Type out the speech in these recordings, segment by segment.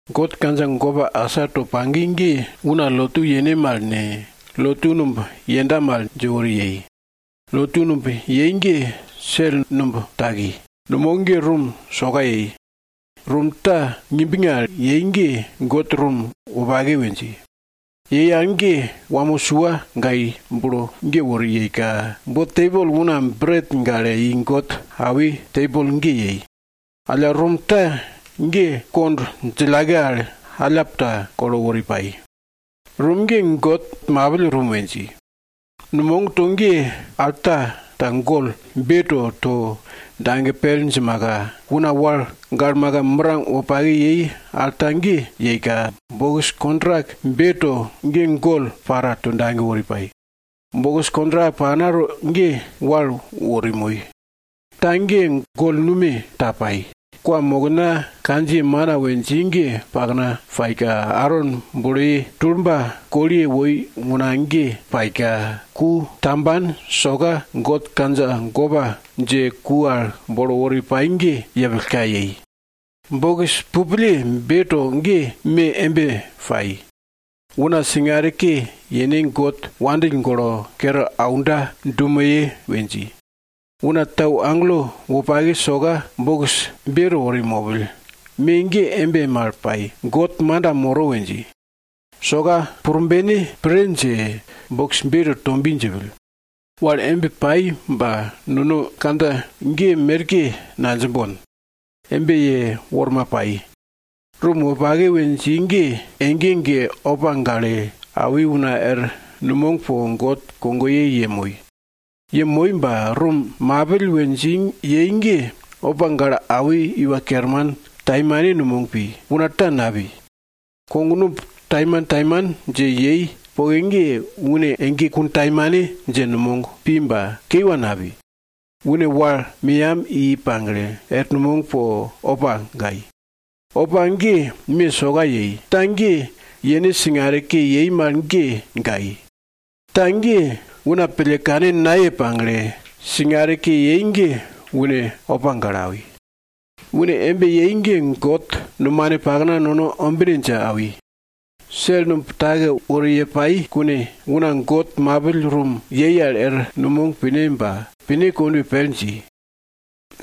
God kandja gopa asa to pagi ge, una lotu yene mal ne, lotu numb yenda mal dje wori yei. Lotu numb yei ge, sel numb taki. Numog ge rum soka yei. Rum ta ngimbnge al yei ge, God rum wopake we dji. Yei al ge wamo sua gai bulo ge wori yeika, bo tebol una bret gale i God awi tebol ge yei. Alla rum ta ge kond djillake al allap ta kolo wori pai. Rum ge, God mapill rum we dji. Numogto ge, alta ta gol beto to dage pel djimaka, una wal galmaka mirang wopake yei alta ge yeika, bokis kontrak beto ge gol para to dage wori pai. Bokis kontrak paknato ge, wal wori moi. Ta ge gol nume ta pai, kwamokna kandjiye mana we dji ge pakna paika, Aron buloye tulba koliye woi una ge paika, ku tamban soka God kandja gopa dje ku al bolo wori pai ge yepillka yei. Bokis pupille beto ge, me embe pai, una singare ke yene God wandill golo kere aunda dumeye we dji. Una tau agelo wopake soka bokis beto wori mopill, me ge embe mal pai, God manda moro we dji. Soka purbene pre dje bokis beto to bi djipill. Wal embe pai, ba nono kandja ge merke nadjimbon. Embe yeworma pai. Rum wopake we dji ge, ege ege opa gale awi una er numog po God kogoye yemoi. Yemoi ba, rum mapill we dji yei ge, opa gale awi iwa kerman taimane numog pi, una ta napi. Kognumb taimantaiman dje yei poke ge, une ege kuntaimane dje numog pi ba kiwa napi. Une wal meyam i pagle, er numog po opa gai. Opa ge, me soka yei, ta ge yene singare ke yei mal ge gai. Ta ge, una pille kane naye pagle singare ke yei ge une opa gale awi. Une embe yei ge, God Murble nono ombine dje awi. Sel numb take wori ye pai kune, una God mapill rum yei al er numog pine ba, pine kondwe pel dji.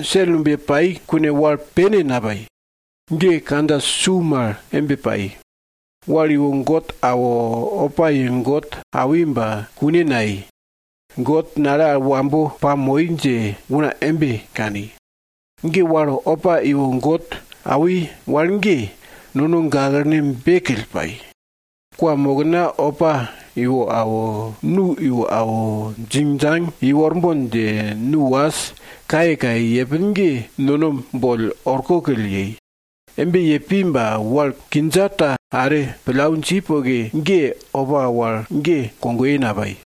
Sel numb ye pai kune wal pene napai. Kandja su mal embe pai. Wal iwo God awo, opa ye God awi ba kune nayei, God nale al wambo pamoi dje una embe kani. Wal opa iwo God awi wal ge, nono gaklene bekill pai. Kwamokna opa iwo awo, nu iwo awo, djingdjang iworbon dje nu was kayekaye yepin ge, nono boll orkokill yei. Embe ye pi ba, wal kindja ta are pillau dji poke ge, opa wal ge kogoye napai.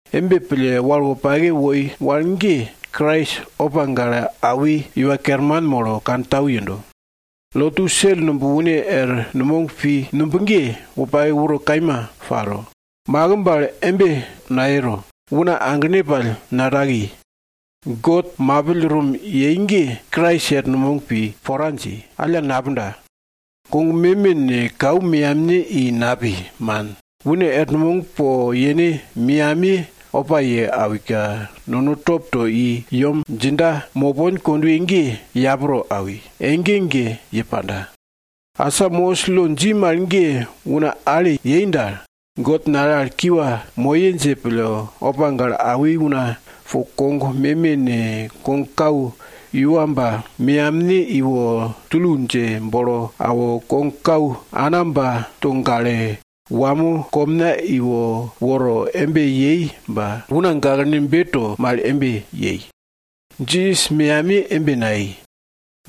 Embe pille, wal wopake woi wal ge, Krais opa gale awi iwa kerman molo kantau yendo. Lotu sel numb une er numog pi numb ge, wopake uro kaima paro, makimb al embe nayero, una aglene pall nataki. God mapill rum yei ge, Krais er numog pi pora dji, alla napunda. Kog meme ne, kau meyamne i napi, man. Une er numog po yene meyamiye opa ye awika, nono top to i yem djinda mopon kondwe ge yapro awi, ege ege ye panda. Asa Mosis lo dji mal ge una ale yei dal, God nale al kiwa moye dje pille, opa gale awi una po kog meme ne, kogkau iwamba meyamne iwo tulu dje bolo awo, kogkau anamba to gale, wamo komna iwo woro embe yei ba, una gaklene beto mal yei. Jisas meyamiye embe nayei.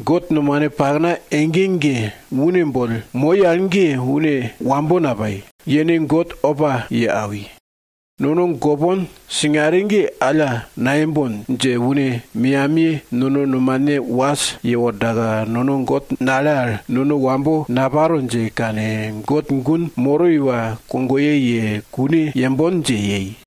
God Murble ege ege une boll moi al ge, une wambo napai, yene God opa ye awi. Nono gopon singare ge alla nayembon dje une meyamiye nono nomane was yewordaka, God nale al nono wambo naparo dje kane, God gun moro iwa kogoye ye kune yembon dje yei.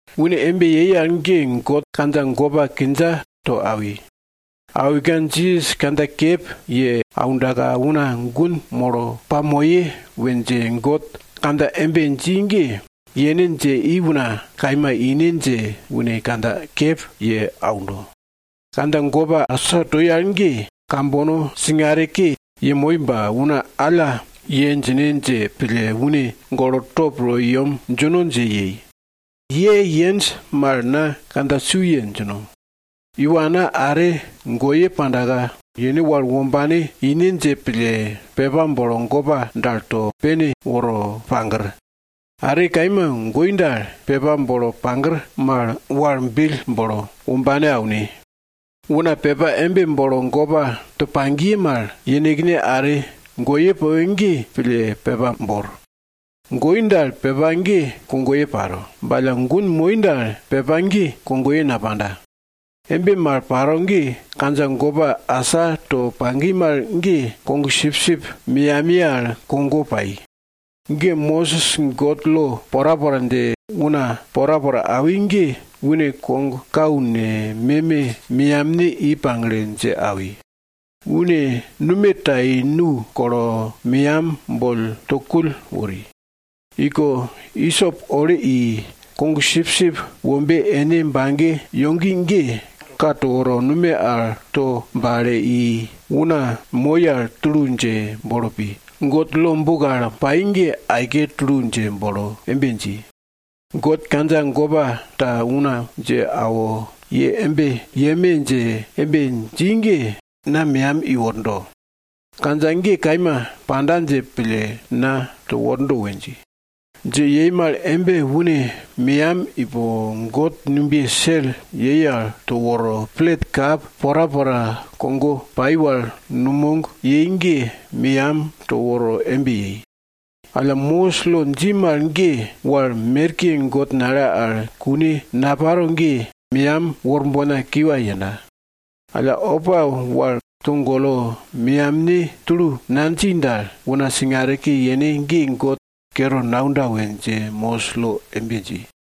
Une embe yei al ge, God kandja gopa kindja to awi. Awika Jisas kandja kep ye aundaka, una gun molo pamoye we dje God kandja embe dji ge, yene dje i una kaima ine dje une kandja kep ye aundo. Kandja gopa asa toi al ge, kambono singare ke yemoi ba, una alla ye djine dje pille une golo top to i yem djino dje yei. Ye yenj mal na kandja su ye djino. Iwana are goye pandaka, yene wal wombane ine dje pille pepa bolo gopa dal to pene woro pagir. Are kaima goi dal, pepa bolo pagir mal wal bill bolo wombane aune. Una pepa embe bolo gopa to pagiye mal, yenekne are goye poke ge pille pepa bor. Goi dal, pepa ge kogoye panda. Ba alla gun moi dal, pepa ge kogoye napanda. Embe mal paro ge, kandja gopa asa to pagi mal ge, kogsipsip meyamiye al kogo pai. Mosis God lo porapora dje una porapora awi ge, une kogkau ne, meme meyamne i pagle dje awi. Une nume ta i nu kolo, meyam boll to kull wori. Iko isop ole i, kogsipsip wombe ene bage yogi ge ka to woro, nume al to bale i, una moi al tulu dje bolo pi, God lo buk al pai ge aike tulu dje bolo embe dji, God kandja gopa to una dje awo, ye embe yeme dje embe dji ge, na meyam iwordo. Kandja ge kaima panda dje pille na to wordo we dji. Dje yei mal embe une meyam ipo God numbiye sel yei al to woro, plet kap porapora kogo pai wal numog yei ge, meyam to woro embe yei. Alla Mosis lo dji mal ge, wal merke God nale al kune naparo ge, meyam worbona kiwa yenda. Alla opa wal togolo meyamne tulu nadji dal, una singare ke yene ge God kere naunda we dje Mosis lo embe dji.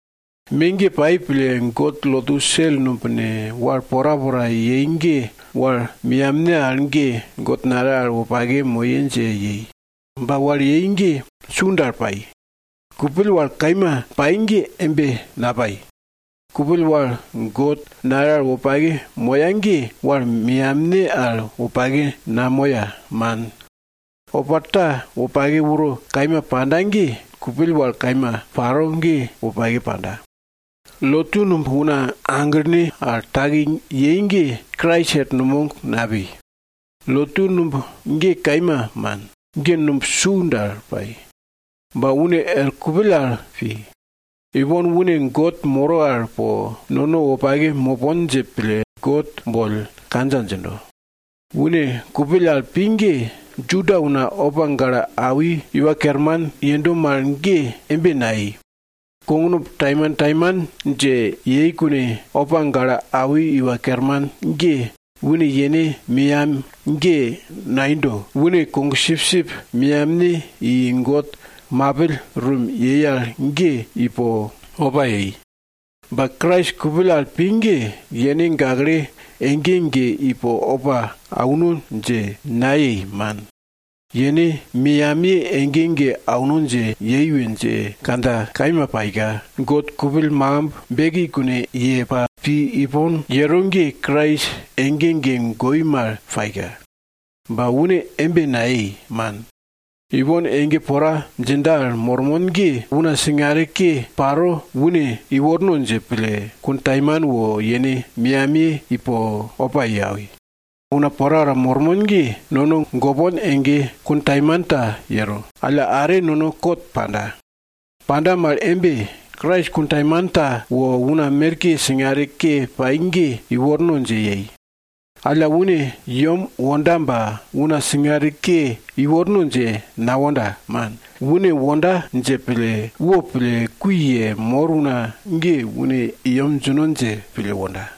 Me ge pai pille, God lotu sel numb ne, wal porapora yei ge, wal meyamne al ge, God nale al wopake moye dje yei. Ba wal yei ge su dal pai. Kupill wal kaima pai ge embe napai. Kupill wal God nale al wopake moya ge, wal meyamne al wopake namoya, man. Opa ta, wopake uro kaima panda ge, kupill wal kaima paro ge wopake panda. Lotu numb una aglene al taki yei ge, Krais er numog napi. Lotu numb ge kaima man, ge numb su dal pai. Ba une er kupill al pi. Ipon une God moro al po nono wopake mopon dje pille God boll kandja djindo. Une kupill al pi ge, Juda una opa gale awi iwa kerman yendo mal ge embe nayei. Kognumb taimantaiman dje yei kune, opa gale awi iwa kerman ge, une yene meyam ge naindo, une kogsipsip meyamne i, God mapill rum yei al ge, ipo opa yei. Ba Krais kupill al pi ge, yene gakle ege ege ipo opa auno dje nayei, man. Yene meyamiye ege ege auno dje yei we dje kandja kaima paika, God kupill makimb beki kune ye pa pi ipon yero ge, Krais ege ege goi mal paika. Ba une embe nayei, man. Ipon ege pora djinda al mormon ge, una singare ke paro une iworno dje pille, kuntaimane wo yene meyamiye ipo opa ye awi. Una porapora mormon ge, nono gopon ege kun taimanta yero, alla are nono kot panda. Panda mal embe, Krais kun taimanta wo una merke singare ke pai ge iworno dje yei. Alla, une yem wonda ba una singare ke iworno dje nawonda, man. Une wonda dje pille, wopille kui yemor una ge, une i yem djino dje pille wonda.